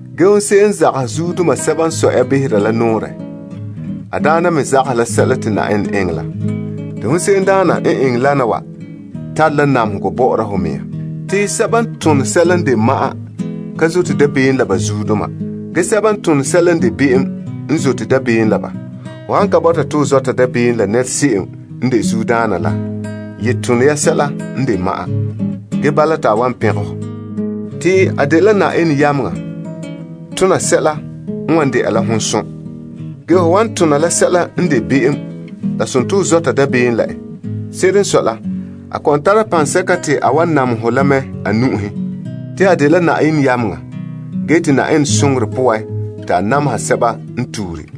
Ge hon se'em n zagahɛ zuodoma sɛba n sɔe ya behera la nɔɔrɛ, a daana me zagahɛ la sɛla te Yenɛ eŋɛ la. Te hon se'emdaana n eŋɛ lana wa tare la namehegɔ bɔ'ɔra ho mea. Te sɛba n tone sɛla n de ma'an ka zote dabeem la ba zuodoma. Ge sɛba n ton tona sɛla n de be'em n zote dabeem la ba. Ho han ka bɔta te ho zɔta dabeem la nɛra se'em n de zuodaana la, ye tone ya sɛla n de ma'an. Ge bala te a wan pɛngɛ hɔ. Ba dela Yenɛ yameŋa tona sɛla n wan dɛna hon som. Ge ho han tone la sɛla n de be'em la dela ho zɔta dabeem la en. Se'ere n sɔe la, a kɔ'ɔn tara paŋsɛka te a wan namehɛ ho la mɛ a nu'uhen. Ba dela Yenɛ yameŋa ge te Yenɛ soŋorɛ poan, te ba namehɛ sɛbadoma n tuure.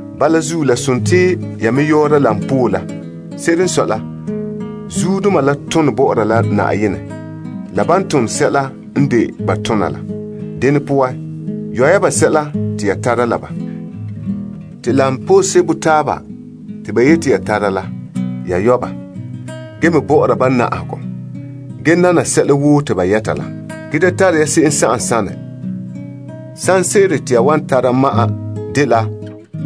Bala zuo, la dela ya me yɔɔra ya teŋa la koberɛ. Se'ere n sɔe la, zuodoma la tone bɔ'ɔra la Yenɛ la ban tone sɛla n de ba tona la. Dene poan, yɔ ya ba sɛla te ya tara la ba. Te koberɛ sebo taaba te ba yeti ya tare la, ya yɔ ba. Ge me bɔ'ɔra ba na'ahegɔ, ge nana sɛla woo te ba yɛta la. Ge da tare ya se'em sanɛ han dagɛna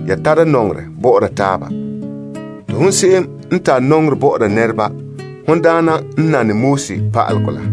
ya tara nɔŋerɛ bɔ'ɔra taaba. Te hon se'em n tare nɔŋerɛ bɔ'ɔra nɛreba, hon daana n nane pa'alegɔ la.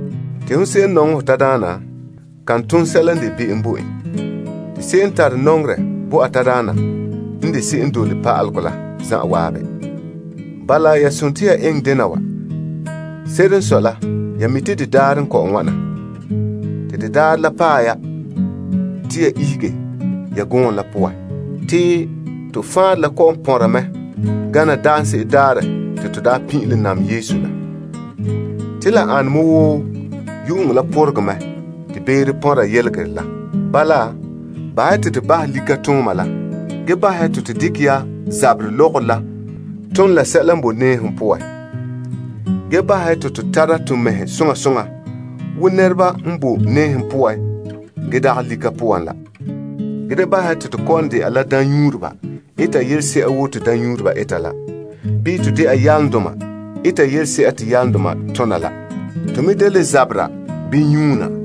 Hon se'em n nɔŋɛ ho tadaana, kan ton be'em bo en. Te se'em n tare nɔŋerɛ n de se'em n dole pa'alegɔ la zanwaabe. Bala eŋɛ ya dena wa. Se'ere n sɔe la ya mi' te de daarɛ la paɛ ya te ya ihege ya gɔɔm la poan. To faanrɛ la kɔ'ɔn pɔnra mɛ gana daanse'ere daarɛ te to daa pin'ilom nam Yesu la. Te la ane me wo yu'uŋɔ la pɔregɛ mɛ te beere pɔnra yelegerɛ la. Bala, bahɛ ya te to bahɛ likatooma la ge bahɛ ya te to dekɛ ya zabera lɔgɔrɔ la ton la sɛla n boe nɛɛhom poan. Ge bahɛ ya te to tara to mɛhe soŋa soŋa wo nɛreba n boe nɛɛhom poan ge dagɛ lika poan la. Ge da bahɛ ya te kɔ'ɔn dɛna daamnyuureba eta yelese'a wo te daamnyuureba eta la. Bii to dɛna yalomdoma eta yelese'a te yalomdoma tona la. To me da le zabera bii nyuuna.